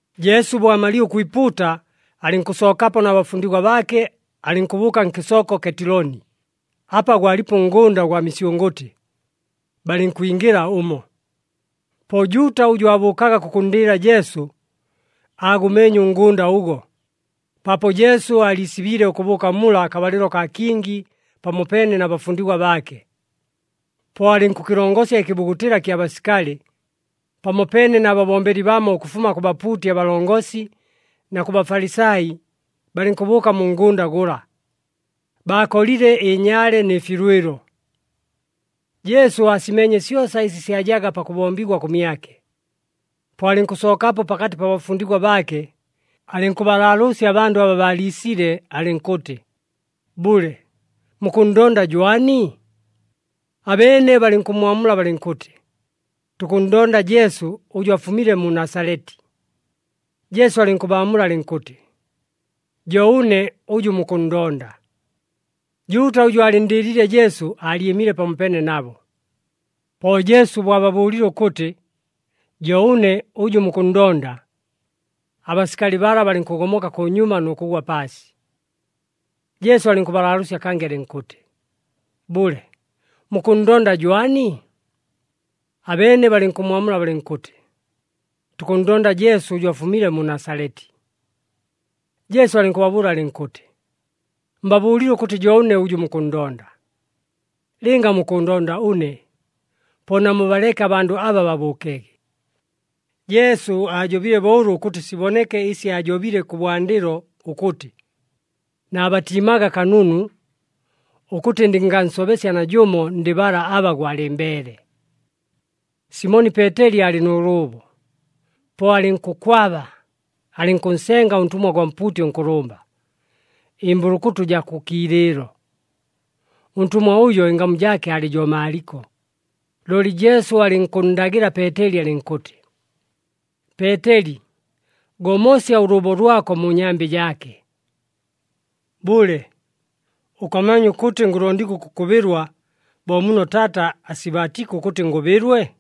Jesu bo amalile ʉkwipuuta, alɨnkʉsookapo na bafundigwa baake, alɨnkʉbʉʉka nkɨsooko Ketiloni, apa gwalipo ʉngʉnda ʉgwa misyʉngʉtɨ. Balɨnkwingɨla ʉmo. Po Juuta ʉjʉ aabʉʉkaga kʉkʉnndɨɨla Jesu, aagʉmeenye ʉngʉnda ʉgo, paapo Jesu aaliisibiile ʉkʉbʉʉka mula akabalɨlo kaa kingi pamopeene na bafundigwa baake. Po alɨnkʉkɨlongosya ɨkɨbugutɨla kya basikali, pamopeene na babombeli bamo ʉkʉfuma kʉ bapuuti abalongosi na kʉ Bafalisai, balɨnkʉbʉʉka mu ngʉnda gʉla, baakolile ɨnyaale nɨ filwɨlo. Jesu aasimeenye syosa ɨsi syajaga pakʉbombigwa kʉmyake. Po alɨnkʉsookapo pakatɨ pa bafundigwa baake, alɨnkʉbalaalʉʉsya abandʉ aba baaliisile alɨnkʉtɨ, “Bʉle, mukʉnndonda jwani?” Abeene balɨnkʉmmwamula balɨnkʉtɨ, “Tukʉnndonda Jesu ʉjʉ afumile mu Nasaleti.” Jesu alɨnkʉbaamula alɨnkʉtɨ, “Jo ʉne ʉjʉ mukʉnndonda.” Juuta ʉjʉ aalɨnndɨɨliile Jesu aalyɨmile pamopeene nabo. Po Jesu bo ababʉʉlile ʉkʉtɨ, “Jo ʉne ʉjʉ mukʉnndonda,” abasikali bala balɨnkʉgomoka kʉnyuma nʉ kʉgwa paasi. Jesu alɨnkʉbalaalʉʉsya kangɨ alɨnkʉtɨ, “Bʉle, mukʉnndonda jwani?” Abeene balɨnkʉmmwamula balɨnkʉtɨ, “Tukʉnndonda Jesu ʉjʉ afumile mu Nasaleti.” Jesu alɨnkʉbabʉʉla alɨnkʉtɨ, “Mbabʉʉlile ʉkʉtɨ jo ʉne ʉjʉ mukʉnndonda. Lɨnga mukʉʉndonda ʉne, po namubaleke abandʉ aba babʉʉkege.” Jesu aajobile bo ʉlo ʉkʉtɨ siboneke ɨsi aajobile kʉbwandɨlo ʉkʉtɨ, “Naabatiimaga kanunu, ʉkʉtɨ ndɨngansobesya najʉmo ndɨ bala aba gwalɨmbeele.” Simoni Peeteli aalɨ nʉ lʉʉbo, po alɨnkʉkwaba, alɨnkʉnsenga ʉntʉmwa gwa mpuuti ʉnkʉlʉmba, ɨmbʉlʉkʉtʉ jaa kʉ kiilɨɨlo. Ʉntʉmwa ʉjo ɨngamu jaake aalɨ jo Maalɨko. Looli Jesu alɨnkʉnndagɨla Peeteli alɨnkʉtɨ, “Peeteli, gomosya ʉlʉʉbo lwako mu nyambɨ jaake. Bʉle, ʉkamanya ʉkʉtɨ ngʉlondigwa ʉkʉkʉbɨlwa bo muno Taata asibaatiike ʉkʉtɨ ngʉbɨlwe?”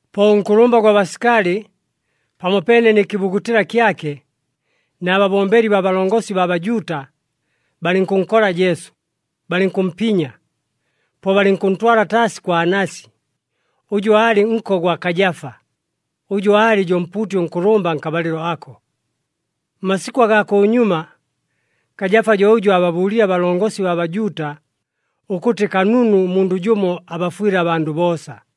Po ʉnkʉlʉmba gwa basikali, pamopeene nɨ kɨbugutɨla kyake, na babombeli baa balongosi baa Bajuuta, balɨnkʉnkola Jesu, balɨnkʉmpinya. Po balɨnkʉntwala taasi kwa Anasi, ʉjʉ aalɨ nko gwa Kajafa, ʉjʉ aalɨ jo mpuuti ʉnkʉlʉmba nkabalɨlo ako. Mmasikʉ agaa kʉnyuma, Kajafa jo ʉjʉ aababʉʉlile abalongosi baa Bajuuta, ʉkʉtɨ kanunu ʉmundʉ jʉmo abafwɨle abandʉ boosa.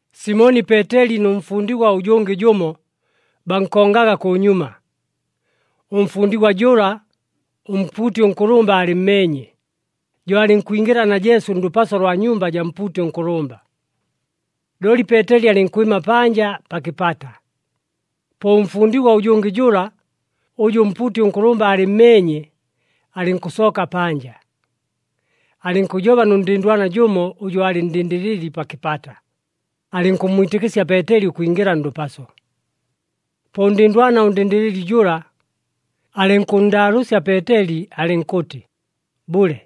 Simoni Peeteli nʉ mfundigwa ʉjʉngɨ jʉmo, bankongaga kʉnyuma. Ʉmfundigwa jʉla, ʉmpuuti ʉnkʉlʉmba aalɨmmeenye, jo alɨnkwingɨla na Jesu ndʉpaso lwa nyumba jaa mpuuti ʉnkʉlʉmba. Looli Peeteli alɨnkwɨma panja pa kɨpata. Po ʉmfundigwa ʉjʉngɨ jʉla, ʉjʉ ʉmpuuti ʉnkʉlʉmba aalɨmmeenye, alɨnkʉsooka panja. Alɨnkʉjoba nʉ ndɨndwana jʉmo ʉjʉ aalɨ ndɨndɨlɨli pa kɨpata, alɨnkʉmmwitɨkɨsya Peeteli ʉkwingɨla ndʉpaso. Po ʉndɨndwana ʉndɨndɨlɨli jʉla, alɨnkʉnndaalʉʉsya Peeteli alɨnkʉtɨ, “Bʉle,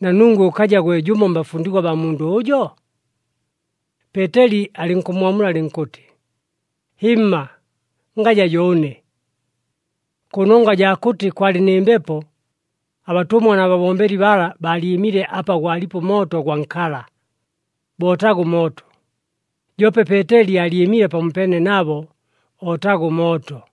na nungwe ʉkaja gwe jʉmo mbafundigwa baa mundʉ ʉjo?” Peeteli alɨnkʉmmwamula alɨnkʉtɨ, “Hɨmma, ngaja jo ʉne.” Kʉnongwa jaa kʉtɨ kwalɨ nɨ mbepo, abatʉmwa na babombeli bala baalyɨmile apa gwalipo ʉmooto gwa nkala, bootaga ʉmooto. Joope Peeteli aalyɨmile pamopeene nabo, ootaga ʉmooto.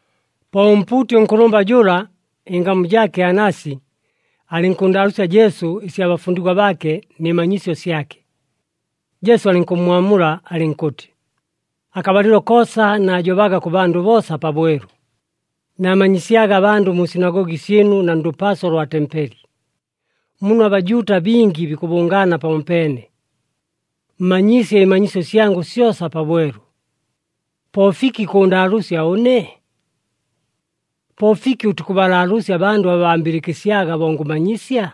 Po ʉmpuuti ʉnkʉlʉmba jʉla, ɨngamu jaake Anasi, alɨnkʉnndaalʉʉsya Jesu ɨsya bafundigwa baake nɨ manyisyo syake. Jesu alɨnkʉmmwamula alɨnkʉtɨ, “Akabalɨlo koosa naajobaga kʉ bandʉ boosa pabwelu, naamanyisyaga abandʉ mu sinagogi syɨnu na ndʉpaso lwa tempeli, muno aBajuuta bingi bikʉbʉngaana pamopeene. Mmanyiisye ɨmanyisyo syangʉ syosa pabwelu. Po fiki kʉʉndaalʉʉsya ʉne? Po fiki ʉtikʉbalaalʉʉsya abandʉ aba bambɨlɨkɨsyaga bo ngʉmanyisya?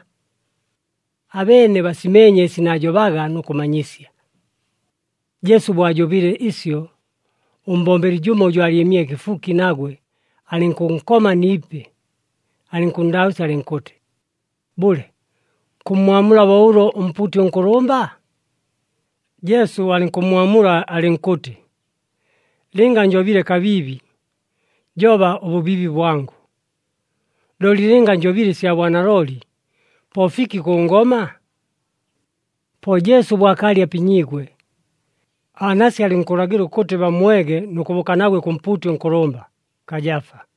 Abeene basimeenye ɨsi naajobaga nʉ kʉmanyisya.” Jesu bo ajobile ɨsyo, ʉmbombeli jʉmo ʉjʉ aalyɨmile kɨfuki nagwe, alɨnkʉnkoma ni ipi, alɨnkʉnndaalʉʉsya alɨnkʉtɨ, “Bʉle, kʉmmwamula bo ʉlo ʉmpuuti ʉnkʉlʉmba?” Jesu alɨnkʉmmwamula alɨnkʉtɨ, “Lɨnga njobile kabiibi, joba ʉbʉbiibi bwangʉ. Looli lɨnga njobile ɨsya bwanalooli, po fiki kʉngoma?” Po Jesu bo akaalɨ apinyiigwe, Anasi alɨnkʉlagɨla ʉkʉtɨ bammwege nʉ kʉbʉʉka nagwe kʉ mpuuti ʉnkʉlʉmba, Kajafa.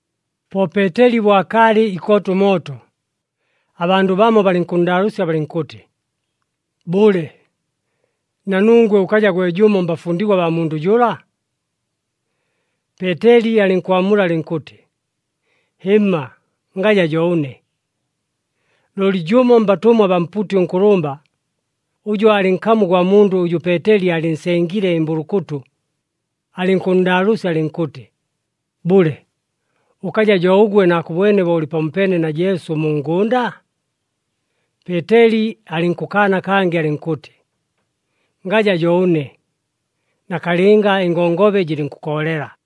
Po Peeteli bo akaalɨ ikoota ʉmooto, abandʉ bamo balɨnkʉnndaalʉʉsya balɨnkʉtɨ, “Bʉle, na nungwe ʉkaja gwe jʉmo mbafundigwa baa mundʉ jʉla?” Peeteli alɨnkwamula alɨnkʉtɨ, “Hɨmma, ngaja jo ʉne.” Looli jʉmo mbatʉmwa abaa mpuuti ʉnkʉlʉmba, ʉjʉ aalɨ nkamu gwa mundʉ ʉjʉ Peeteli aalɨnsengile ɨmbʉlʉkʉtʉ, alɨnkʉnndaalʉʉsya alɨnkʉtɨ, “Bʉle, ʉkaja jo ʉgwe naakʉbwene bo ʉlɨ pamopeene na Jesu mu ngʉnda?” Peeteli alɨnkʉkaana kangɨ alɨnkʉtɨ, “Ngaja jo ʉne.” Nakalɨnga ɨngongobe jɨlɨnkʉkoolela.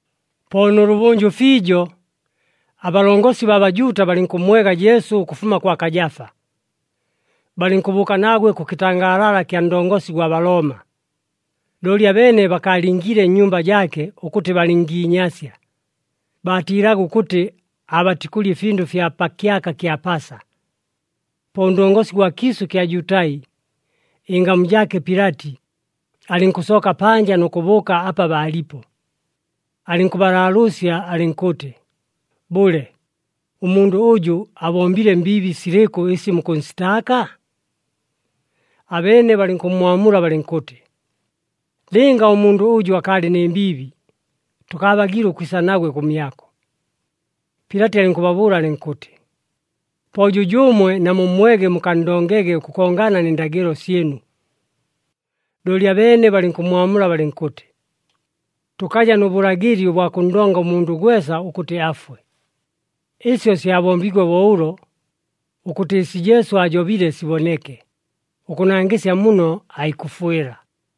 Po nʉlʉbʉnjʉ fiijo, abalongosi baa Bajuuta balɨnkʉmmwega Jesu ʉkʉfuma kwa Kajafa. Balɨnkʉbʉʉka nagwe kʉ kɨtangaalala kya ndongosi gwa Balooma. Looli abeene bakaalingiile nnyumba jaake ʉkʉtɨ balɨngiinyasya, baatiilaga ʉkʉtɨ aabatikʉlya ɨfindʉ fya pa kyaka kya Pasa. Po ʉndongosi gwa kiisʉ ɨkya Jutai, ɨngamu jaake Pilati, alɨnkʉsooka panja nʉ kʉbʉʉka apa baalipo, alɨnkʉbalaalʉʉsya alɨnkʉtɨ, “Bʉle, ʉmundʉ ʉjʉ abombile mbiibi silɨkʉ ɨsi mukʉnsitaaka?” Abeene balɨnkʉmmwamula balɨnkʉtɨ, “Lɨnga ʉmundʉ ʉjʉ akaalɨ nɨ mbiibi, tʉkaabagiile ʉkwisa nagwe kʉmyako.” Pilati alɨnkʉbabʉʉla alɨnkʉtɨ, “Po jʉjʉʉmwe namummwege mukanndongege ʉkʉkongana nɨ ndagɨlo syɨnu.” Looli abeene balɨnkʉmmwamula balɨnkʉtɨ, “Tʉkaja nʉ bʉlagɨli ʉbwa kʉnndonga ʉmundʉ gwesa ʉkʉtɨ afwe.” Ɨsyo syabombiigwe bo ʉlo, ʉkʉtɨ ɨsi Jesu aajobile siboneke, ʉkʉnangɨsya muno aikʉfwɨla.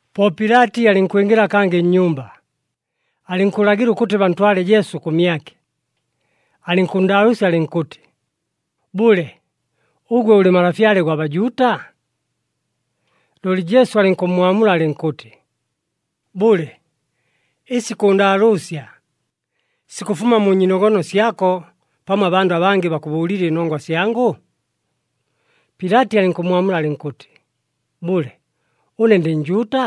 Po Pilati alɨnkwingɨla kangɨ nnyumba, alɨnkʉlagɨla ʉkʉtɨ bantwale Jesu kʉmyake, alɨnkʉnndaalʉʉsya alɨnkʉtɨ, “Bʉle, ʉgwe ʉlɨ Malafyale gwa Bajuuta?” Looli Jesu alɨnkʉmmwamula alɨnkʉtɨ, “Bʉle, ɨsi kʉʉndaalʉʉsya, sikʉfuma mu nyiinogono syako pamo abandʉ abangɨ bakʉbʉʉlile ɨnongwa syangʉ?” Pilati alɨnkʉmmwamula alɨnkʉtɨ, “Bʉle, ʉne ndɨ Njuuta?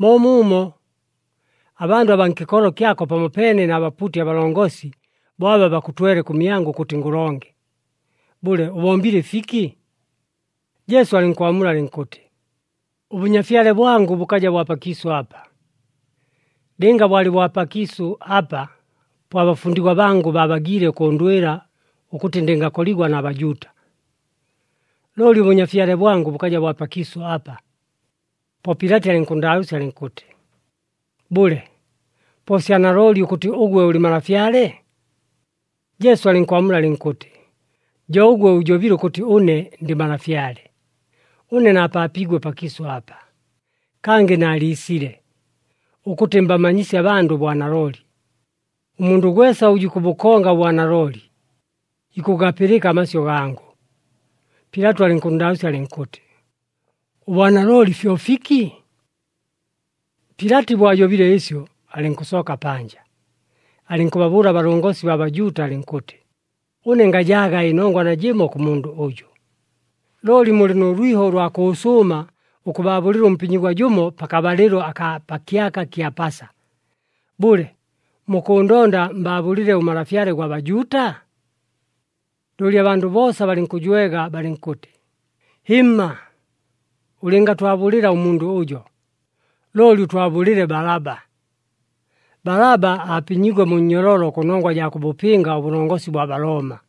Moomuumo, abandʉ abaa nkɨkolo kyako pamopeene na bapuuti abalongosi bo aba bakʉtwele kʉmyangʉ ʉkʉtɨ ngʉlonge. Bʉle, ʉbombile ɨfiki?” Jesu alɨnkwamula alɨnkʉtɨ, “ɄBʉnyafyale bwangʉ bʉkaja bwa pakiisʉ apa. Lɨnga bwalɨ bwa pakiisʉ apa, po abafundigwa bangʉ baabagiile ʉkʉʉndwɨla ʉkʉtɨ ndɨngakoligwa na Bajuuta. Looli ʉBʉnyafyale bwangʉ bʉkaja bwa pakiisʉ apa.” Po Pilati alɨnkʉnndaalʉʉsya alɨnkʉtɨ, “Bʉle, po sya nalooli ʉkʉtɨ ʉgwe ʉlɨ malafyale?” Jesu alɨnkwamula alɨnkʉtɨ, “Jo ʉgwe ʉjobile ʉkʉtɨ ʉne ndɨ malafyale. Ʉne naapaapiigwe pakiisʉ apa, kangɨ naaliisile, ʉkʉtɨ mbamanyisye abandʉ ʉbwanalooli. Ʉmundʉ gwesa ʉjʉ ikʉbʉkonga ʉbwanalooli, ikʉgapɨlɨka amasyʉ gangʉ.” Pilati alɨnkʉnndaalʉʉsya alɨnkʉtɨ, “Ʉbwanalooli fyo fiki?” Pilati bo ajobile ɨsyo, alɨnkʉsooka panja, alɨnkʉbabʉʉla abalongosi baa Bajuuta alɨnkʉtɨ, “Ʉne ngajaaga ɨnongwa najɨmo kʉ mundʉ ʉjʉ. Looli mulɨ nʉ lwiho ʉlwa kʉʉsʉʉma ʉkʉbaabʉlɨla ʉmpinyigwa jʉmo pakabalɨlo akaa pa kyaka kya Pasa. Bʉle, mukʉʉndonda mbaabʉlɨle ʉMalafyale gwa Bajuuta?” Looli abandʉ boosa balɨnkʉjwega balɨnkʉtɨ, “Hɨmma! Ʉlɨngatwabʉlɨla ʉmundʉ ʉjo, looli ʉtwabʉlɨle Balaba!” Balaba aapinyiigwe mu nnyololo kʉnongwa jaa kʉbʉpɨnga ʉbʉlongosi bwa Balooma.